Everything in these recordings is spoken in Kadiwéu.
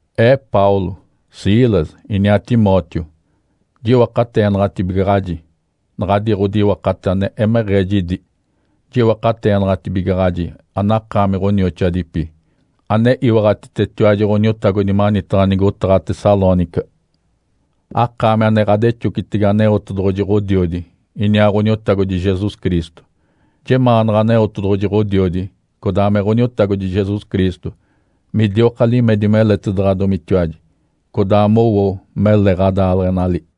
Ee Paulo, Silas, iniaa Timóteo, jiwakateenaɡ̶atibigaɡ̶aji naɡ̶adi ɡ̶odiwakate ane emeɡ̶ee jidi. Jiwakateenaɡ̶atibigaɡ̶aji anakaami ɡ̶onioxoadipi, ane iwaɡ̶atitetiwaji Ǥoniotagodi manitaɡ̶a nigotaɡ̶a Tessalônica, akaami ane ɡ̶adexocitege Aneotedoɡ̶oji Ǥodiodi, iniaa Ǥoniotagodi Jesus Cristo. Jemaanaɡ̶a Aneotedoɡ̶oji Ǥodiodi, codaa me Ǥoniotagodi Jesus Cristo midioka limedi meletaɡ̶adomitiwaji, codaa mowo mele ɡ̶adaaleɡ̶enali.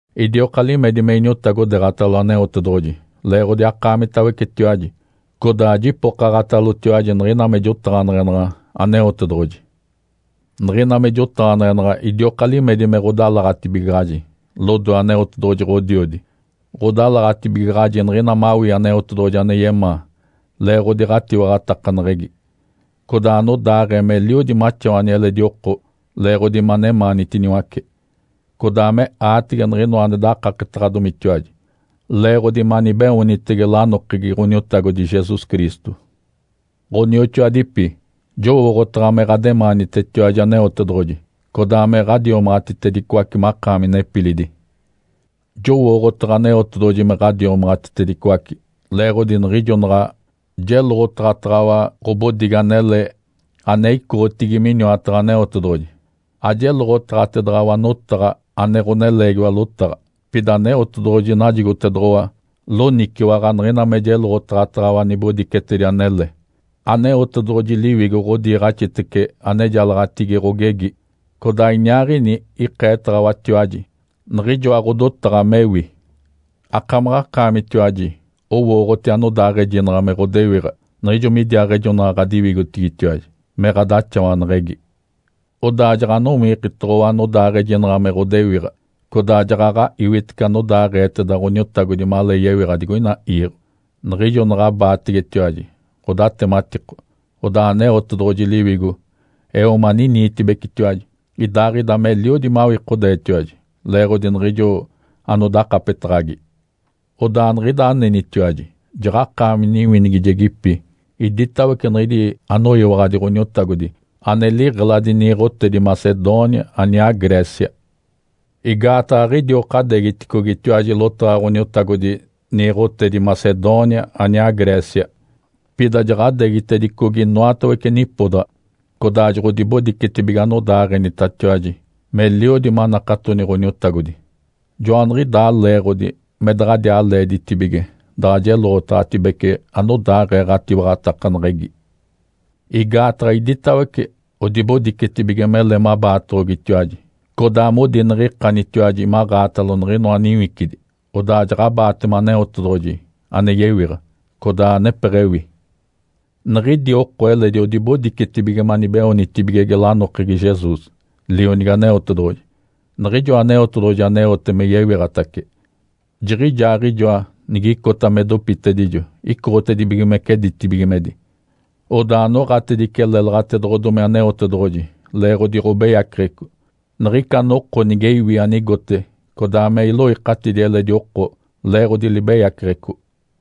Idioka limedi me iniotagodeeɡ̶atalo Aneotedoɡ̶oji leeɡ̶odi akaamitawecetiwaji, codaa jipokaɡ̶atalotiwaji niɡ̶ina me jotaɡ̶aneɡ̶enaɡ̶a Aneotedoɡ̶oji. Niɡ̶ina me jotaɡ̶aneɡ̶enaɡ̶a idioka limedi me ɡ̶odalaɡ̶atibigaɡ̶aji lodoe Aneotedoɡ̶oji Ǥodiodi. Ǥodalaɡ̶atibigaɡ̶aji niɡ̶ina mawii Aneotedoɡ̶oji ane yemaa leeɡ̶odi ɡ̶atiwaɡ̶atakaneɡ̶egi, codaa anodaaɡ̶ee meliodi maxawani eledi oko leeɡ̶odi manemaanitiniwace, codaa me aatege niɡ̶inoa ane dakaketaɡ̶adomitiwaji leeɡ̶odi manibeoonitege lanokegi Ǥoniotagodi Jesus Cristo. Ǥonioxoadipi, jowooɡ̶otaɡ̶a me ɡ̶ademaanitetiwaji Aneotedoɡ̶oji, codaa me ɡ̶adiomaɡ̶atitedicoace makaami nepilidi. Jowooɡ̶otaɡ̶a Aneotedoɡ̶oji me ɡ̶adiomaɡ̶atitedicoace leeɡ̶odi niɡ̶ijo naɡ̶a jeloɡ̶otaɡ̶ataɡ̶awa ɡ̶obodigi anele ane icoɡ̶otigi miniwataɡ̶a Aneotedoɡ̶oji, ajeloɡ̶otaɡ̶atedaɡ̶awa notaɡ̶a ane ɡ̶oneleegiwa lotaɡ̶a, pida Aneotedoɡ̶oji najigotedoɡ̶owa loniciwaɡ̶a niɡ̶ina me jeloɡ̶otaɡ̶ataɡ̶awa nibodicetedi anele, Aneotedoɡ̶oji Liwigo ɡ̶odiiɡ̶axitece anejalaɡ̶atigi ɡ̶ogegi, codaa iniaaɡ̶ini ikeetaɡ̶awatiwaji niɡ̶ijoa ɡ̶odotaɡ̶a mewi. Akamaɡ̶akaamitiwaji owooɡ̶oti anodaaɡ̶ejinaɡ̶a me ɡ̶odewiɡ̶a niɡ̶ijo midiaaɡ̶ejonaɡ̶a ɡ̶adiwigotigitiwaji me ɡ̶adaxawaneɡ̶egi. Odaa jaɡ̶anowikitoɡ̶owa anodaaɡ̶ejinaɡ̶a me ɡ̶odewiɡ̶a, codaa jaɡ̶aɡ̶a iwitece anodaaɡ̶eeteda Ǥoniotagodi malee yewiɡ̶a digoina iiɡ̶o. Niɡ̶ijo naɡ̶abaategetiwaji ɡ̶odatematiko, odaa Aneotedoɡ̶oji Liwigo eo maniniitibecetiwaji, idaaɡ̶ida meliodi mawikodeetiwaji leeɡ̶odi niɡ̶ijo anodakapetaɡ̶agi. Odaa niɡ̶ida anenitiwaji jaɡ̶akaami niwinigijedipi iditawece niɡ̶idi anoyiwaɡ̶adi Ǥoniotagodi ane liɡ̶eladi niiɡ̶otedi Macedônia aniaa Grécia. Igaataɡ̶a aɡ̶idioka adeegiticogitiwaji lotaɡ̶a Ǥoniotagodi niiɡ̶otedi Macedônia aniaa Grécia. Pida jaɡ̶adeegitedicogi inoatawece nipodaɡ̶a, codaa joɡ̶odibodicetibige anodaaɡ̶enitatiwaji meliodi manakatoni Ǥoniotagodi. Joaniɡ̶idaa leeɡ̶odi me daɡ̶adiaa leeditibige daɡ̶a jeloɡ̶otaɡ̶atibece anodaaɡ̶ee ɡ̶atiwaɡ̶atakaneɡ̶egi. Igaataɡ̶a iditawece odibodicetibige mele mabaatoɡ̶ogitiwaji, codaa modi niɡ̶ikanitiwaji maɡ̶aatalo niɡ̶inoa niwicidi, odaa jaɡ̶abaatema Aneotedoɡ̶oji ane yewiɡ̶a, codaa anepeɡ̶ewi. Niɡ̶idi oko eledi odibodicetibige manibeoonitibigege lanokegi Jesus, Lionigi Aneotedoɡ̶oji, Niɡ̶ijoa Aneotedoɡ̶oji aneote me yewiɡ̶atace. Jiɡ̶ijaaɡ̶ijoa nigicota me dopitedijo icoɡ̶otedibigimece ditibigimedi, odaa noɡ̶atedice lélaɡ̶atedoɡ̶odomi Aneotedoɡ̶oji leeɡ̶odi ɡ̶obeyaceɡ̶eco niɡ̶ica noko nige iwi anigote codaa me iloikatidi eledi oko leeɡ̶odi libeyaceɡ̶eco.